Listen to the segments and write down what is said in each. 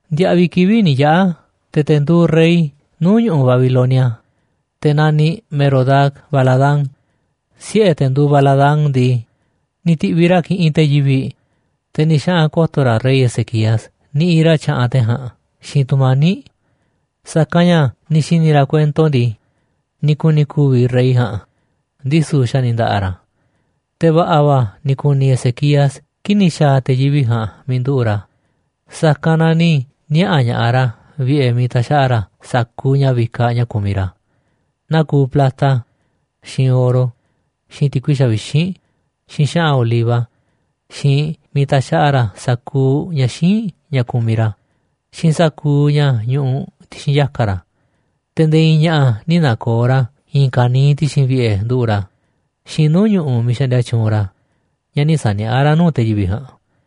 Ndiaꞌviꞌ kivi̱ꞌ ni̱ yaꞌa̱, te̱ te̱ nduuꞌ rey nuu̱ꞌ ñu̱ꞌuꞌ Babilonia, te̱ naniꞌ Merodac-baladán, siꞌe̱ te̱ nduuꞌ Baladán ndii, ni̱ ti̱ꞌviꞌ ra̱ kiꞌinꞌ te̱ yivi̱ꞌ, te̱ ni̱ xaꞌa̱n ko̱to̱ ra̱ rey Ezequías niꞌiꞌ ra̱ tyaꞌanꞌ te̱ ja̱a̱nꞌ xiinꞌ tu̱mani̱ꞌ. Sa̱kanꞌ ña̱ ni̱ xi̱ni̱ ra̱ kuento ndii, ni̱ ku̱ni̱ ku̱vi̱ rey ja̱a̱nꞌ, ndisu̱ xa̱ ni̱ nda̱ꞌa̱ ra̱. Te̱ va̱ꞌa̱ va̱ ni̱ ku̱ni̱ Ezequías kii̱ꞌ ni̱ xa̱a̱ te̱ yivi̱ꞌ ja̱a̱nꞌ miiꞌ nduꞌu̱ꞌ ra̱, sa̱kanꞌ na ni̱ niaꞌa̱ ña̱ꞌaꞌ ra̱ vi̱ꞌe̱ miiꞌ taxaꞌa ra̱ sa̱kuuꞌ ña̱ vikaꞌ ña̱ kumiꞌ ra̱. Naa kuuꞌ plata, xiinꞌ oro, xiinꞌ ti̱kui xavixínꞌ, xiinꞌ xa̱ꞌa̱n oliva, xiinꞌ miiꞌ taxaꞌa ra̱ sa̱kuuꞌ ña̱ xíinꞌ ña̱ kumiꞌ ra̱, xiinꞌ sa̱kuuꞌ ña̱ ñuꞌuꞌ ti̱xi̱n yaka̱ ra̱. Te̱ nde̱e̱ i̱i̱n ña̱ꞌa̱ nï̱ na̱ko̱o̱ ra̱ i̱i̱n kaniiꞌ ti̱xi̱n vi̱ꞌe̱ nduꞌu̱ꞌ ra̱ xiinꞌ nuu̱ꞌ ñu̱ꞌuꞌ miiꞌ xaꞌndia tyuunꞌ ra̱ ña̱ nï̱ sa̱niaꞌá ra̱ nuu̱ꞌ te̱ yivi̱ꞌ ja̱a̱nꞌ.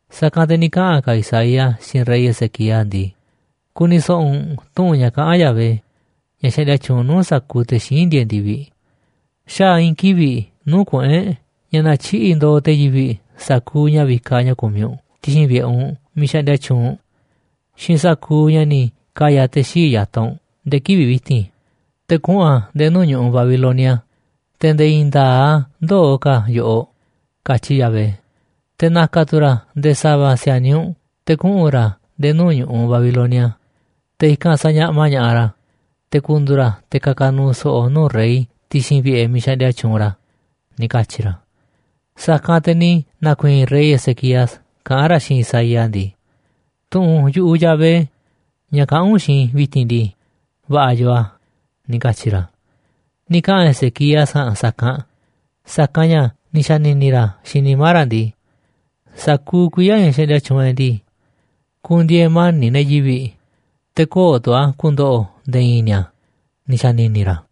Sa̱kanꞌ te̱ ni̱ kaꞌa̱n ka̱ Isaías xiinꞌ rey Ezequías ndii: ―Ku̱ni̱ so̱ꞌo̱ u̱nꞌ tu̱ꞌu̱n ña̱ kaꞌán Yahvé, ña̱ xaꞌndia tyuunꞌ nu̱uꞌ sa̱kuuꞌ te̱ xíinꞌ ndieeꞌ ndi̱viꞌ: “Xaa̱ i̱i̱n kivi̱ꞌ nuu̱ꞌ kuꞌu̱n e̱ꞌ ña̱ na̱tyiꞌi̱ꞌ ndo̱o̱ te̱ yivi̱ꞌ sa̱kuuꞌ ña̱ vikaꞌ ña̱ kumiꞌ u̱nꞌ ti̱xi̱n vi̱ꞌe̱ u̱nꞌ miiꞌ xaꞌndia tyuunꞌ u̱nꞌ xiinꞌ sa̱kuuꞌ ña̱ ni̱ ka̱ya̱ te̱ xii̱ꞌ ya̱taꞌ u̱nꞌ nde̱e̱ kivi̱ꞌ vi̱ti̱n, te̱ kuꞌu̱n a̱ nde̱e̱ nuu̱ꞌ ñu̱ꞌuꞌ Babilonia, te̱ nde̱e̱ i̱i̱n nda̱a̱ꞌ a̱ ndöo̱ ka̱ yoꞌoꞌ”, katyi Yahvé. Te̱ na̱ka̱ tu̱ ra̱ nde̱e̱ sa̱va̱ si̱a̱niꞌ u̱nꞌ te̱ kuꞌu̱n ra̱ nde̱e̱ nuu̱ꞌ ñu̱ꞌuꞌ Babilonia, te̱ i̱kanꞌ sa̱ñaꞌma ña̱ꞌaꞌ ra̱, te̱ ku̱ndu̱u̱ ra̱ te̱ ka̱ka̱ nu̱u̱ so̱ꞌo̱ nuu̱ꞌ rey ti̱xi̱n vi̱ꞌe̱ miiꞌ xaꞌndia tyuunꞌ ra̱ ―ni̱ katyi̱ ra̱. Sa̱kanꞌ te̱ ni̱ na̱ku̱i̱i̱n rey Ezequías kaꞌán ra̱ xiinꞌ Isaías ndii: ―Tu̱ꞌu̱n yu̱ꞌuꞌ Yahvé, ña̱ kaꞌán u̱nꞌ xiinꞌ i̱ vi̱ti̱n ndii, va̱ꞌa̱ yoo a̱ ―ni̱ katyi̱ ra̱. Ni̱ kaꞌa̱n Ezequías ja̱a̱nꞌ sa̱kanꞌ, sa̱kanꞌ ña̱ ni̱ xa̱ni̱ni̱ ra̱ xiinꞌ nimá ra̱ ndii: “Sa̱kuuꞌ kuiya̱ ña̱ xaꞌndia tyuunꞌ e̱ꞌ ndii, ku̱ndi̱e̱e̱ mani̱ꞌ ne̱ yivi̱ꞌ, te̱ köo̱ꞌ tu̱ a̱ ku̱ndo̱ꞌo̱ nde̱e̱ i̱i̱n ni̱a̱”, ni̱ xa̱ni̱ni̱ ra̱.